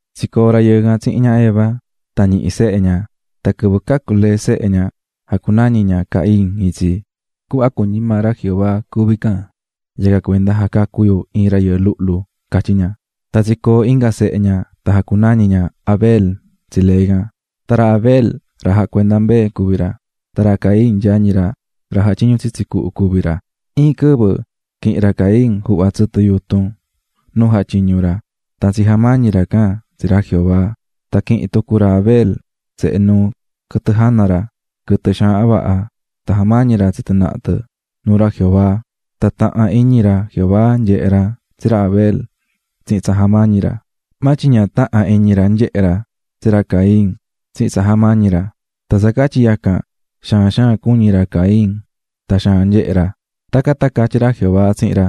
Tsicoo̱ rayɨɨ can tsihin ña Eva tan ñihi̱ sehe ña, tan quɨvɨ cacu̱ lee sehe ña jacunañi̱ ña Caín itsi. "Cuhva cuñí maa ra Jehová cuví ihya, yacan cuenda tsaha̱ ra rayɨɨ luhlu tsi yu", catyí ña. Tan tsicoo̱ inga sehe ña tan jacunañi̱ ña Abel tsi lee can. Tsa tsahnu ra Abel jacuendá ra mbee, tan ra Caín yañi ra, ra jatyiñú tsitsi cuhu cuví ra. Iin quɨvɨ quihi̱n ra Caín juhva tsɨtɨ yutun nuu jatyiñú ra tan tsijamañi̱ ra can tsi ra Jehová. Tan quihi̱n tucu ra Abel sehe nuu quɨtɨ jana ra, quɨtɨ xaahan vaha tan jamañi̱ ra tsi tɨ naha tɨ nuu ra Jehová. Tan taha̱n iñi ra Jehová nyehe̱ ra tsi ra Abel tsihin tsa jamañi̱ ra. Maa tyin ña taha̱n iñi ra nyehe̱ ra tsi ra Caín tsihin tsa jamañi̱ ra, tan tsa catyi yacan, xaan xaan cuñí ra Caín tan xaan nyehé ra. Tacan tan catyí ra Jehová tsihin ra: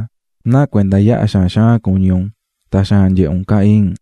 "¿Náa cuenda yaha xaan xaan cuñí un tan xaan nyehé un, Caín?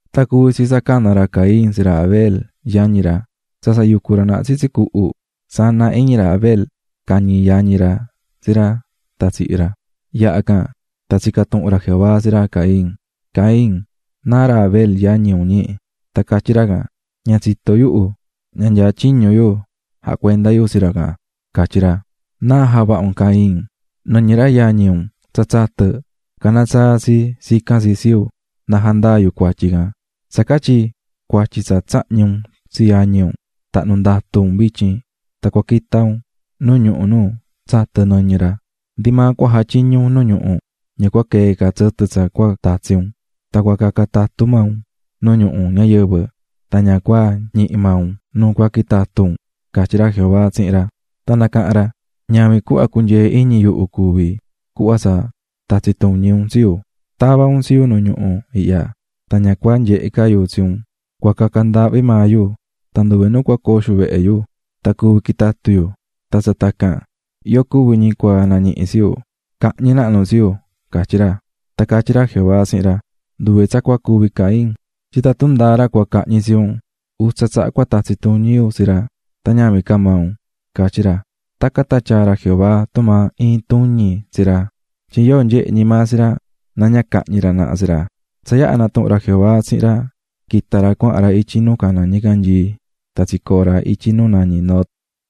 Tan cuvi̱ tsi tsa cana̱ ra Caín tsi ra Abel yañi ra cuahan ra naha cuhu. Tsa tsa yucú ra naha tsitsi cuhu, sana iñi ra Abel cañi̱ ra Caín tsi ra tan tsihi̱ ra. Yaha can, tan tsica̱ tuhun ra Jehová tsi ra Caín: --¿Caín, náa ra Abel yañi un, ñi? Tan catyí ra can: --Ña tsitó yuhu, ña nyaá tyiñu yu jacuendá yu tsi ra can --catyí ra. --¿Náa javaha̱ un, Caín? Nɨñɨ ra yañi un tsa tsatɨ̱, caná tsaa tsi tsicán tsi tsi yu na jandaa yu cuatyi ihya. Tsa catyi tsa tsahñi̱ un tsi yañi un, tahnu̱ ndatu un vityin tan cua quita un nu ñuhu nu tsatɨ̱ nɨñɨ ra. Ndi maa cua jatyiñu un nu ñuhu ña cua quee ca tsɨtɨ tsa cua tatsi un. Tan cua caca tatu maa un nu ñuhu ñayɨvɨ tan ña cua ñihi maa un nu cua quitatu un --catyí ra Jehová tsihin ra. Tan nacaha̱n ra: --Ñavin cuhva cunyee iñi yuhu cuví cuhva tsa tatsí tuñi un tsi yu. Tavá un tsi yu nu ñuhu ihya, tan ña cua nyehe ca yu tsi un, cua caca ndaahvi maa yu, tan nduve nu cua coo xuvehe yu, tan cuvi quitatu yu. Tan tsa tacan, yóo cuvi ñi maa cua nañihi tsi yu cahñi nahnu tsi yu --catyí ra. Tan catyí ra Jehová tsihin ra: --Nduve tsa cua cuvi, Caín, tyin tatun ndáa ra cua cahñi tsi un, utsa tsaha cua tatsi tuñi yu tsi ra tan ñavin tumaa tatsi̱ tuñi yu tsi maa un --catyí ra. Tacan tan tyaa̱ ra Jehová tumaa iin tuñi tsi ra, tyin yóo nyehe ñi maa tsi ra na ña cahñi ra naha tsi ra. Tsa yaha natuhu̱n ra Jehová tsihin ra, quita̱ ra cuahan ra ityi nu caná ñicanyii tan tsicoo̱ ra ityi nu nañí Nod.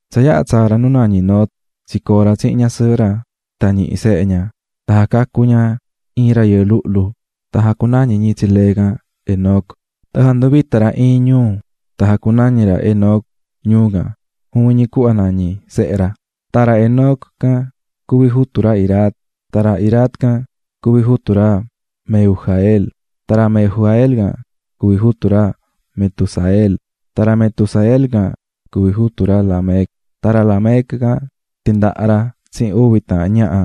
Tsa yaha tsaa̱ ra nu nañí Nod, tsicoo̱ ra tsihin ñasɨɨhɨ ra tan ñihi̱ sehe ña. Tan jacacu̱ ña iin rayɨɨ luhlu tan jacunañi̱ ñi tsi lee can, Enoc. Tan janduvita̱ ra iin ñuu tan jacunañi̱ ra Enoc, ñuu can, juvin ñi cuhva nañí sehe ra. Tan ra Enoc can cuví jutu ra Irad, tan ra Irad can cuví jutu ra Mehujael, tan ra Mehujael can cuví jutu ra Metusael, tan ra Metusael can cuví jutu ra Lamec. Tan ra Lamec can tindaha̱ ra tsihin uvi taahan ñaha,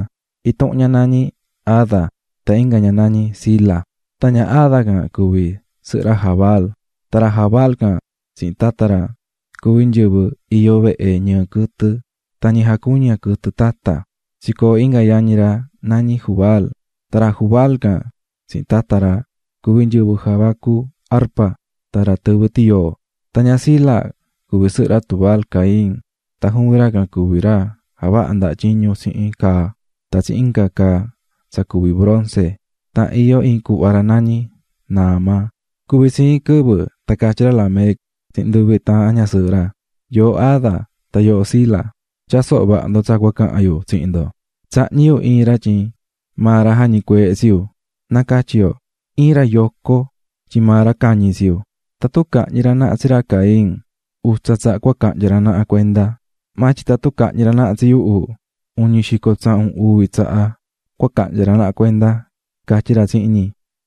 intuhun ña nañí Ada, tan inga ña nañí Zila. Tan ña Ada can cuví sɨhɨ ra Jabal. Tan ra Jabal can tsihin nyɨvɨ tata ra iyó ñi vehe tsinu̱ tsihin ñɨɨ quɨtɨ tan nyɨvɨ jacuñá quɨtɨ tata cuví ñi. Tsicoo̱ inga yañi ra nañí Jubal tan ra Jubal can tsihin tata ra cuví nyɨvɨ javacú arpa tan ra tɨvɨ tiyoo. Tan ña Zila cuví sɨhɨ ra Tubal-caín, tan juvin ra can cuví ra javahá ndaha tyiñu tsihin caa tan tsihin inga caa tsa cuví bronce, tan iyó iin cuhva ra nañí Naama. Cuvi̱ tsi iin quɨvɨ tan catyí ra Lamec tsihin nduvi taahan ñasɨɨhɨ ra: "Yooho Ada tan yooho Zila, tya̱soho vaha ndo tsa cua cahan yu tsihin ndo: Tsahñi̱ yu iin ra tyin maa ra jañicueehe̱ tsi yu, na catyi yo, iin ra yoco tyin maa ra cañi̱ tsi yu. Tatun cahñi ra naha tsi ra Caín, utsa tsaha cua cahnya ra naha cuenda, maa tyin tatun cahñi ra naha tsi yuhu, uñi xico tsahun uvi tsaha cua cahnya ra naha cuenda", catyí ra tsihin ñi.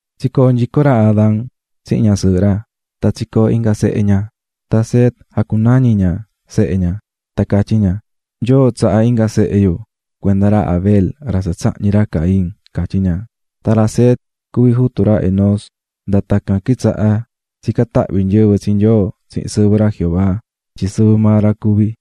Tsicoo̱ nyico ra Adán tsihin ñasɨɨhɨ ra tan tsicoo̱ inga sehe ña, tan Set jacunañi̱ ña sehe ña, tan catyí ña: "Nyoo tsaha̱ inga sehe yu cuenda ra Abel ra tsa tsahñi̱ ra Caín", catyí ña. Tan ra Set cuví jutu ra Enós. Nda tacan tan quitsaha̱ tsicán tahvi nyɨvɨ tsi Nyoo tsihin sɨvɨ ra "Jehová" tyin sɨvɨ maa ra cuví.